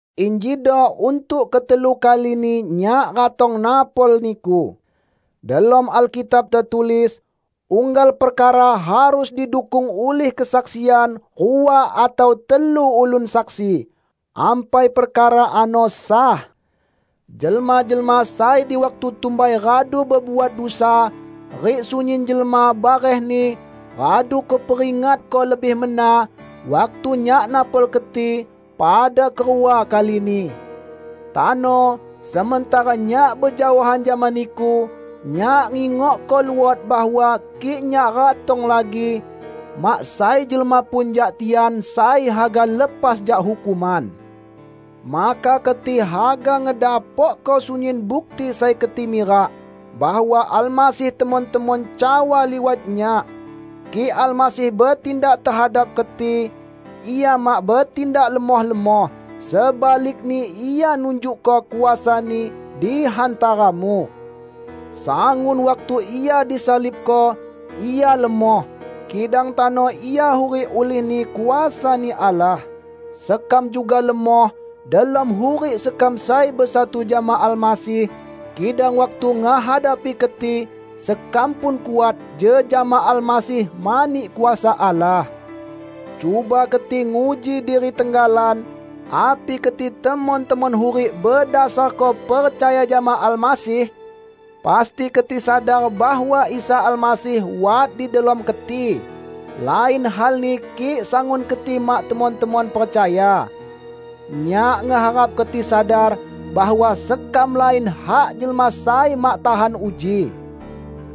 Injido untuk ketelu kalini nyak ratong napol niku. Delom Alkitab tetulis, "Unggal perkara harus didukung ulih kesaksian rua atau telu ulun saksi, ampai perkara ano sah." Jelma-jelma sai di waktu tumbai radu bebuat dusa rik sunyin jelma barehni, radu kuperingatko lebih mena waktu nyak napol keti pada kerua kalini. Tano, sementara nyak bejaohan jama niku, nyak ngingokko luot bahwa kik nyak ratong lagi, mak sai jelma pun jak tian sai haga lepas jak hukuman. Maka keti haga ngedapokko sunyin bukti sai keti mirak bahwa Almasih temon-temon cawa liwat nyak. Kik Almasih betindak tehadap keti, Ia mak betindak lemoh-lemoh, sebalikni Ia nunjukko kuasa-Ni di hantaramu. Sangun waktu Ia disalibko, Ia lemoh, kidang tano Ia hurik ulihni kuasa-Ni Allah. Sekam juga lemoh delom hurik sekam sai besatu jama Almasih, kidang waktu ngehadapi keti, sekam pun kuat jejama Almasih mani kuasa Allah. Cuba keti nguji diri tenggalan api keti temon-temon hurik bedasarko percaya jama Almasih! Pasti keti sadar bahwa Isa Almasih wat di delom keti! -- lain halni kik sangun keti mak temon-temon percaya. Nyak ngeharap keti sadar bahwa sekam lain hak jelma sai mak tahan uji.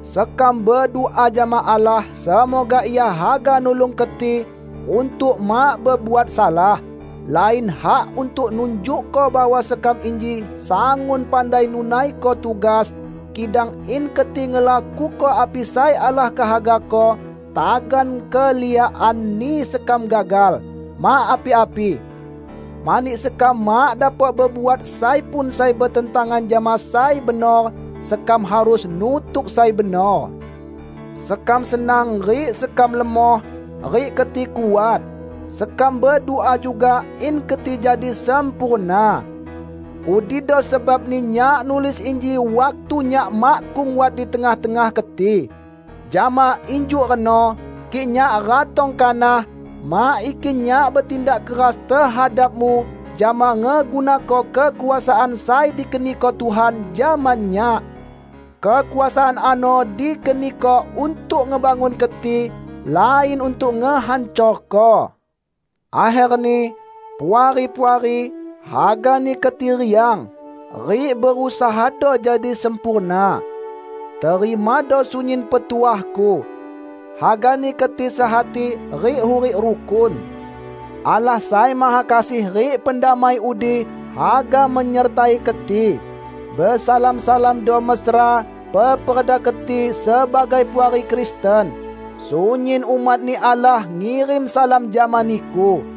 Sekam bedua jama Allah semoga Ia haga nulung keti untuk mak bebuat salah. Lain hak untuk nunjukko bahwa sekam inji sangun pandai nunaiko tugas, kidang in keti ngelakuko api sai Allah kehagako -- tagan keliakanni sekam gagal, mak api-api! Mani sekam mak dapok bebuat sai pun sai betentangan jama sai benor, sekam harus nutuk sai benor. Sekam senang rik sekam lemoh, rik keti kuat. Sekam bedua juga in keti jadi sempurna. Udido sebabni nyak nulis inji waktu nyak makkung wat di tengah-tengah keti. Jama injuk reno, kik nyak ratong kanah, mak ikin nyak betindak keras tehadapmu jama ngegunako kekuasaan sai dikeniko Tuhan jama nyak. Kekuasaan ano dikeniko untuk ngebangun keti, lain untuk ngehancorko. Akherni, Puari-puari, hagani keti riang, rik berusahado jadi sempurna. Terimado sunyin petuahku. Hagani keti sehati rik hurik rukun. Allah Sai Mahakasih rik pendamai udi haga menyertai keti. Besalam-salamando mesra peperda keti sebagai puari Kristen. Sunyin umat-Ni Allah ngirim salam jama niku.